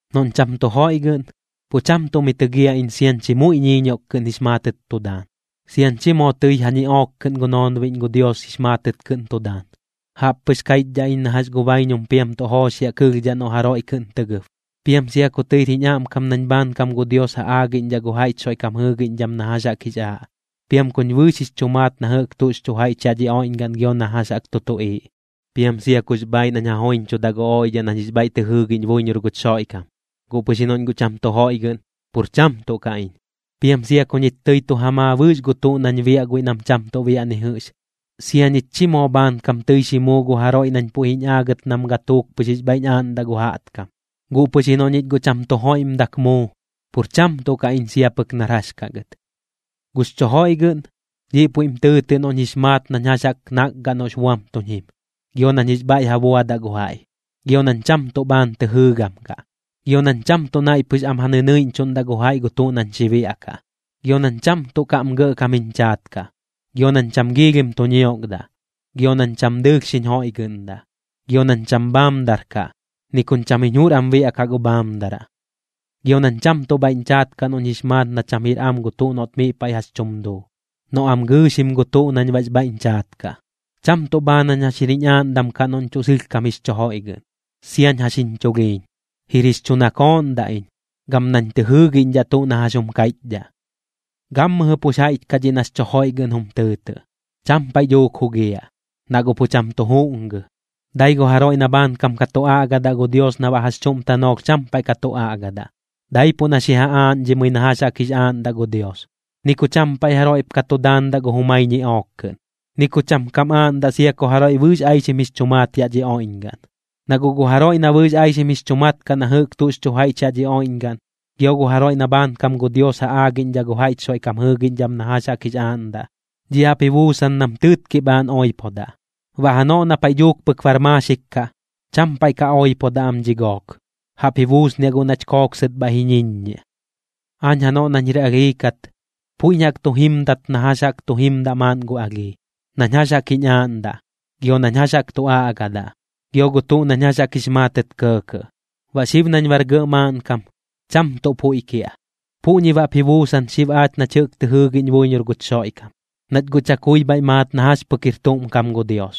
Noꞌñ cham tu joiꞌgɨꞌn, pu cham tuꞌ mi tɨgiaꞌ iñ siañ chi muiꞌ ñiiñioꞌk kɨꞌn jix maatɨt tu daan, siañ chi moo tɨi ja ñiꞌook kɨꞌn gu noonbiꞌñ gu Dios jix maatɨt kɨꞌn tu daan. Jaꞌp pɨx kaiꞌchdhaꞌ iñ na jax gu baiñum piam tuꞌ jooxiaꞌ kɨlhdhaꞌ noꞌ jaroiꞌ kɨꞌn tɨ gɨb. Piam sia ku tɨir jiñ aꞌmkam nañ bhaankam gu Dios ja aagiꞌñdhaꞌ gu jaiꞌch Xoiꞌkam jɨɨgiꞌñdham na jax jaꞌk jix aaꞌ, piam kuñ bɨɨx jix chu maat na jɨꞌk tuꞌx chu jaiꞌch yaꞌ dhi oiꞌñgaꞌn gio na jax jaꞌk tu tuꞌiiꞌ, piam sia kux bhaaiꞌ nañ ja joiñchudaꞌ gu oiꞌdhaꞌ nañ jix bhaiꞌ tɨ jɨɨgiꞌñ buiñor guch Xoiꞌkam, guꞌ pɨx ji noꞌñ guꞌ cham tu joiꞌgɨꞌn, pur cham tuꞌ kaꞌ iñ. Piam sia ku ñich tɨi tu ja maa bɨɨx gu tuꞌ nañ biaꞌ guiꞌ nam cham tuꞌ biaꞌ ni jɨꞌx, sia ñich chi moo bhaankam tɨi xi muu gu jaroiꞌ nañ puiꞌ jiñ aagɨt nam gatuuk pɨx jix bhaiꞌñ aaꞌndaꞌ gu jaꞌtkam, guꞌ pɨx ji noꞌ ñich guꞌ cham tu joiꞌmdak muu, pur cham tuꞌ kaꞌ iñ sia pɨk nar jax kaꞌ gɨt. Gux chu joiꞌgɨꞌn, dhiꞌ puiꞌm tɨɨtɨꞌ noꞌñ jix maat nañ jax jaꞌk nakgaꞌ noꞌx buam tuñ jim, gio nañ jix bhaiꞌ ja buadaꞌ gu jaiꞌ. Gio nañ cham tuꞌ bhaan tɨ jɨɨgam kaꞌ, gio nañ cham tuꞌ naiꞌ pɨx am ja nɨnɨiꞌñchuꞌndaꞌ gu jaiꞌ gu tuꞌ nañ xi biaꞌkaꞌ. Gio nañ cham tuꞌ kaꞌm gɇꞌkam jiñ chaat kaꞌ, gio nañ cham giilhim tu ñiokdaꞌ, gio nañ cham dɨɨlh xiñ joiꞌgɨꞌndaꞌ. Gio nañ cham bhaamdar kaꞌ, ni kuñ cham jiñ jur am biaꞌkaꞌ gu bhaamdaraꞌ. Gio nañ cham tuꞌ bhaiꞌñ chaat kaꞌ noꞌñ jix maat na cham jir am gu tuꞌ noꞌt miꞌ paiꞌ jax tum duu, noꞌ am gɨɨxim gu tuꞌ na baꞌx bhaiꞌñ chaat kaꞌ. Cham tuꞌ bhaan jañ jax jir jiñ aaꞌndam kaꞌ noꞌñ tuꞌ sɨlhkam jix chu joiꞌgɨꞌn, siañ jax jiñ chulhiiñ. Jir jix chu nakooꞌndaꞌ iñ, gam nañ tɨ jɨɨgiꞌñdhaꞌ tuꞌ na jax jum kaiꞌchdhaꞌ. Gammɨjɨ pux jaiꞌch kaꞌ dhiꞌ nax chu joiꞌgɨꞌn jum tɨɨtɨꞌ, cham paiꞌ dhuuk jugiaꞌ, na guꞌ pu cham tu juꞌngɨ. Dai gu jaroiꞌ na bhaankam ka tu aꞌgadaꞌ gu Dios na baꞌ jax chuꞌm tanoolh cham paiꞌ ka tu aꞌgadaꞌ, daipuꞌ na xi ja aaꞌñdhimɨi na jax jaꞌk jix aaꞌndaꞌ gu Dios. Ni ku cham paiꞌ jaroiꞌp ka tu daandaꞌ gu jumai ñiꞌook kɨꞌn, ni ku cham kam aaꞌndaꞌ sia ku jaroiꞌ bɨɨx aixim jix chu maat yaꞌ dhi oiꞌñgaꞌn. Na guꞌ gu jaroiꞌ na bɨɨx aixim jix chu mat kaꞌ na jɨꞌk tuꞌx chu jaiꞌch yaꞌ dhi oiꞌñgaꞌn, gio gu jaroiꞌ na bhaankam gu Dios ja aagiꞌñdhaꞌ gu jaiꞌch Xoiꞌkam jɨɨgiꞌñdham na jax jaꞌk jix aaꞌndaꞌ, dhiꞌ jaꞌp ji buusan nam tɨɨtkiꞌ bhaan oipodaꞌ. Baꞌ janoꞌ na paiꞌ dhuuk pɨk bar maaxik kaꞌ, cham paiꞌ ka oipodaꞌ am dhi gook, jaꞌp ji buusniaꞌ guꞌ nach kooksɨt bhaiꞌ ji ñiññiaꞌ. Aañ janoꞌ nañ jir alhii kat, puiꞌñ jaꞌk tu jimdat na jax jaꞌk tu jimdaꞌ maaꞌn gu alhii, nañ jax jaꞌk jiñ aaꞌndaꞌ, gio nañ jax jaꞌk tu aꞌgadaꞌ, gio gu tuꞌ nañ jax jaꞌk jix maatɨt kɇɇkɇꞌ. Baꞌ xib nañ bar gɇꞌ maaꞌnkam, cham tuꞌ puiꞌ kiaꞌ. Puꞌñi baꞌp ji buusan xib aach nach jɨꞌk tɨ jɨɨgiꞌñ buiñor guch Xoiꞌkam, nach guꞌ chakui bhaiꞌ maat na jax pɨk jir tuꞌm kam gu Dios.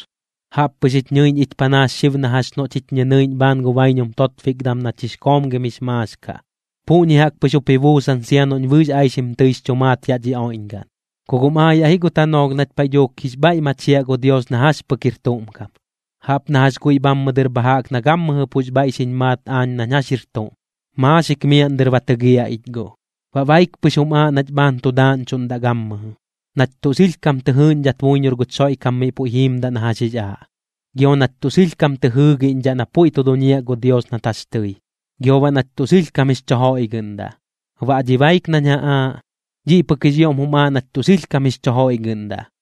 Jaꞌp pɨx jich ñɨiꞌñ ich panaas xib na jax noꞌch jich ñɨnɨiꞌñ bhaan gu baiñum totbikdam nach jix koomgim jix maax kaꞌ. Puꞌñi jaꞌk pɨx jup ji buusan sia noꞌñ bɨɨx aixim tɨix chu maat yaꞌ dhi oiꞌñgaꞌn, ku guꞌm aayaꞌ ji gu tanoolh nach paiꞌ dhuuk jix bhaiꞌ machiaꞌ gu Dios na jax pɨk jir tuꞌm kam, jaꞌp na jax guiꞌ bhammɨ dɨr bha jaꞌk na gammɨjɨ pux bhaiꞌ xiñ maat aañ nañ jax jir tuꞌm, maaxik miaꞌn dɨr ba tɨgiaꞌ ich guꞌ. Baꞌ baik pɨx jum aaꞌ nach bhaan tu daaꞌñchuꞌndaꞌ gammɨjɨ: Nach tuꞌ sɨlhkam tɨ jɨɨꞌñdhat buiñor guch Xoiꞌkam miꞌ puiꞌ jiimdaꞌ na jax jix aaꞌ, gio nach tuꞌ sɨlhkam tɨ jɨɨgiꞌñdhaꞌ na puiꞌ tu duñiaꞌ gu Dios nat jax tɨi, gio baꞌ nach tuꞌ sɨlhkam jix chu joiꞌgɨꞌndaꞌ. Baꞌ dhi baik nañ ja aaꞌ, dhiꞌ pɨk jix ioꞌm jum aaꞌ nach tuꞌ sɨlhkam jix chu joiꞌgɨꞌndaꞌ.